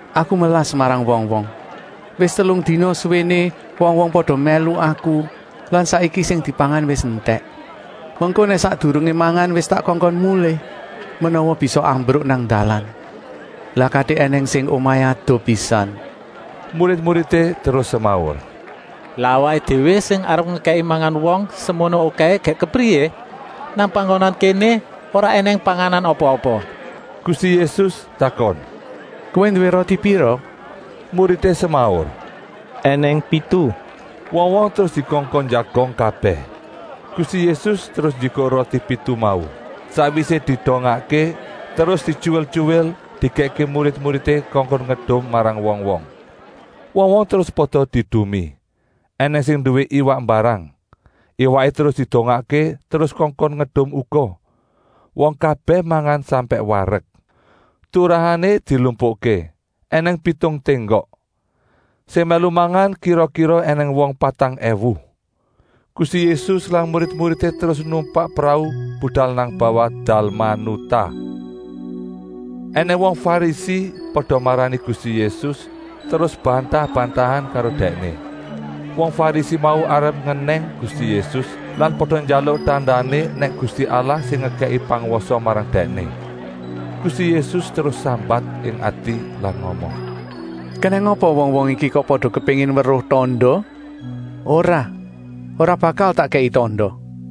“Aku melas marang wong-wong! Wis telung dina suwéné wong-wong pada mèlu Aku lan saiki sing dipangan wis entèk. Mengko nèk sakdurungé mangan wis tak kongkon mulih, menawa bisa ambruk nang dalan. Lah katik ènèng sing omahé adoh pisan.” Murid-muridé terus semaur: “Lah awaké déwé sing arep ngekèki mangan wong semono okèhé gèk kepriyé? Nang panggonan kéné ora ènèng panganan apa-apa!” Gusti Yésus takon: “Kowé nduwé roti pira?” Muridé semaur: “Enèng pitu!” Wong-wong terus dikongkon njagong kabèh. Gusti Yésus terus njikuk roti pitu mau. Sakwisé didongakké terus dityuwil-tyuwil dikèkké murid-muridé kongkon ngedum marang wong-wong. Wong-wong terus pada diedumi. Enèng sing nduwé iwak mbarang. Iwaké terus didongakké terus kongkon ngedum uga. Wong kabèh mangan sampèk warek. Turahané dilumpukké ènèng pitung ténggok. Sing mèlu mangan kira-kira ènèng wong patang èwu. Gusti Yésus lan murid-muridé terus numpak prau budal nang bawah Dalmanutah. Enèng wong Farisi pada marani Gusti Yésus terus bantah-bantahan karo Dèkné. Wong Farisi mau arep ngenèng Gusti Yésus lan pada njaluk tandané nèk Gusti Allah sing ngekèki pangwasa marang Dèkné. Gusti Yésus terus sambat ing ati lan ngomong: “Kenèng apa wong-wong iki kok pada kepéngin weruh tanda? Ora, ora bakal tak kèki tanda!”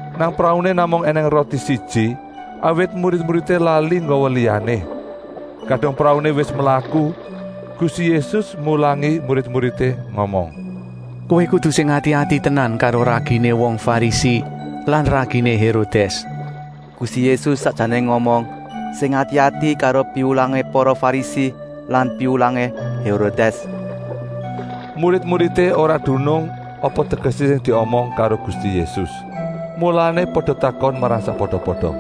Nang prauné namung ènèng roti siji, awit murid-muridé lali nggawa liyané. Kadung prauné wis mlaku, Gusti Yésus mulangi murid-muridé ngomong: “Kowé kudu sing ati-ati tenan karo raginé wong Farisi lan raginé Hérodès.” (Gusti Yésus sakjané ngomong: “Sing ati-ati karo piwulangé para Farisi lan piwulangé Hérodès.”) Murid-muridé ora dunung apa tegesé sing diomong karo Gusti Yésus, mulané pada takon marang sakpada-pada: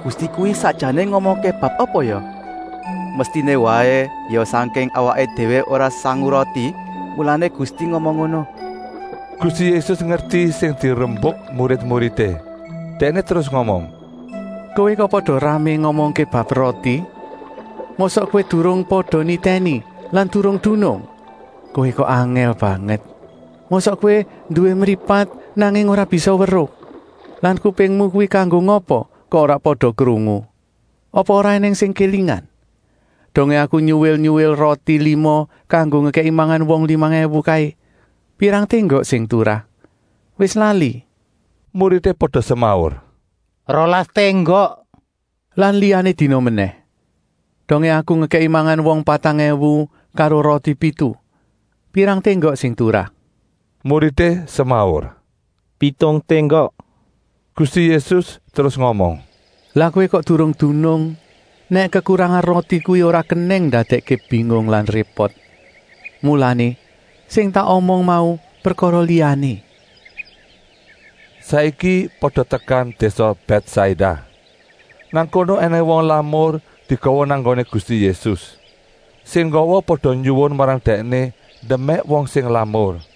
“Gusti kuwi sakjané ngomongké bab apa ya? Mestiné waé ya sangking awaké déwé ora sangu roti, mulané Gusti ngomong ngono!” Gusti Yésus ngerti sing dirembuk murid-muridé. Dèkné terus ngomong: “Kowé kok pada ramé ngomongké bab roti. Mosok kowé durung pada nitèni lan durung dunung? Kowé kok angèl banget! Mosok kowé nduwé mripat, nanging ora bisa weruh. Lan kupingmu kuwi kanggo ngapa kok ora pada krungu? Apa ora ènèng sing kélingan? Dongé Aku nyuwil-nyuwil roti lima kanggo ngekèki mangan wong limang èwu kaé, pirang ténggok sing turah? Wis lali?” Muridé pada semaur: “Rolas ténggok!” “Lan liyané dina menèh, dongé Aku ngekèki mangan wong patang èwu karo roti pitu, pirang ténggok sing turah?” Muridé semaur: “Pitung ténggok!” Gusti Yésus terus ngomong: “Lah kowé kok durung dunung nèk kekurangan roti kuwi ora kenèng ndadèkké bingung lan répot. Mulané, sing tak omong mau prekara liyané.” Saiki pada tekan désa Bètsaida. Nang kono ènèng wong lamur digawa nang nggoné Gusti Yésus. Sing nggawa pada nyuwun marang Dèkné ndemèk wong sing lamur.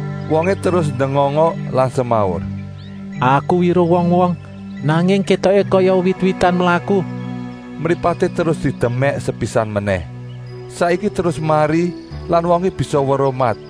Wongé terus ndengongok lan semaur: “Aku weruh wong-wong, nanging kétoké kaya wit-witan mlaku.” Mripaté terus didemèk sepisan menèh. Saiki terus mari lan wongé bisa weruh mat.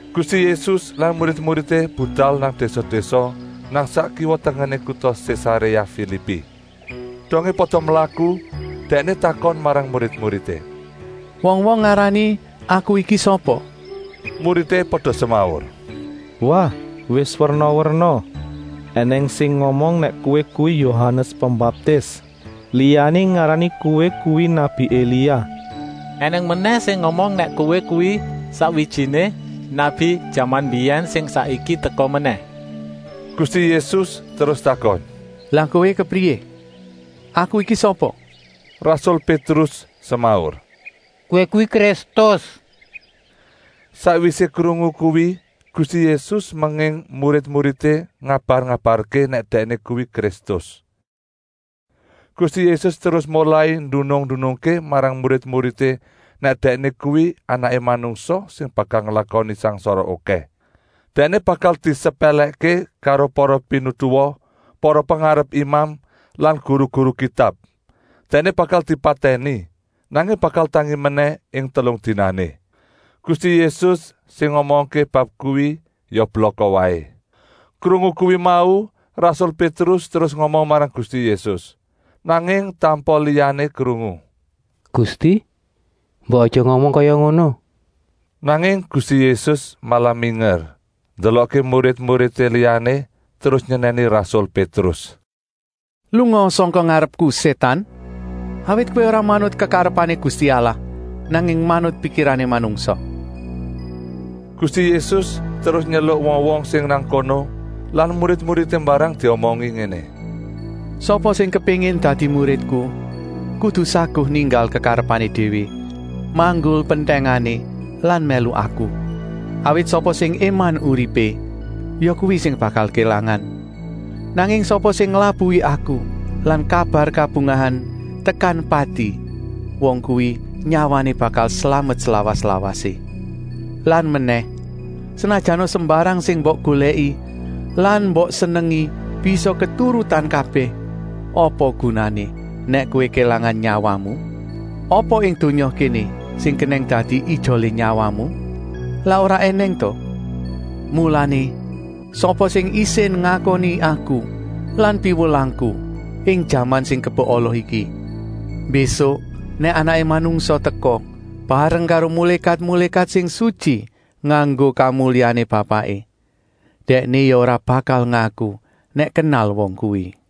Gusti Yésus lan murid-muridé budal nang désa-désa nang sak kiwa-tengené kuta Sésaréa Filipi. Dongé pada mlaku Dèkné takon marang murid-muridé: “Wong-wong ngarani Aku iki sapa?” Muridé pada semaur: “Wah, wis werna-werna! Enèng sing ngomong nèk Kowé kuwi Yohanes Pembaptis. Liyané ngarani Kowé kuwi nabi Elia. Enèng menèh sing ngomong nèk Kowé kuwi sakwijiné nabi jaman mbiyèn sing saiki teka menèh.” Gusti Yésus terus takon: “Lah kowé kepriyé? Aku iki sapa?” Rasul Pétrus semaur: “Kowé kuwi Kristus!” Sakwisé krungu kuwi Gusti Yésus menging murid-muridé ngabar-ngabarké nèk Dèkné kuwi Kristus. Gusti Yésus terus molai ndunung-ndunungké marang murid-muridé nèk Dèkné kuwi Anaké Manungsa sing bakal nglakoni sangsara okèh. Dèkné bakal disepèlèkké karo para pinituwa, para pengarepé imam lan guru-guru Kitab. Dèkné bakal dipatèni, nanging bakal tangi menèh ing telung dinané. Gusti Yésus sing ngomongké bab kuwi ya blaka waé. Krungu kuwi mau rasul Pétrus terus ngomong marang Gusti Yésus, nanging tanpa liyané krungu: “Gusti, mbok aja ngomong kaya ngono!” Nanging Gusti Yésus malah minger ndelokké murid-murid liyané terus nyenèni rasul Pétrus: “Lungaa sangka ngarepku Sétan, awit kowé ora manut kekarepané Gusti Allah, nanging manut pikirané manungsa.” Gusti Yésus terus nyeluk wong-wong sing nang kono lan murid-muridé mbarang diomongi ngéné: “Sapa sing kepéngin dadi muridku kudu saguh ninggal kekarepané déwé, manggul pentèngané lan mèlu Aku. Awit sapa sing éman uripé, yakuwi sing bakal kélangan. Nanging sapa sing nglabuhi Aku lan kabar kabungahan tekan pati, wong kuwi nyawané bakal slamet slawas-lawasé. Lan menèh, senajana sembarang sing mbok golèki lan mbok senengi bisa keturutan kabèh, apa gunané, nèk kowé kélangan nyawamu? Apa ing donya kéné sing kenèng dadi ijolé nyawamu? Lak ora ènèng ta? Mulané, sapa sing isin ngakoni Aku lan piwulangku ing jaman sing kebek ala iki, mbésuk nèk Anaké Manungsa teka, bareng karo mulékat-mulékat sing sutyi nganggo kamulyané Bapaké, Dèkné ya ora bakal ngaku nèk kenal wong kuwi.”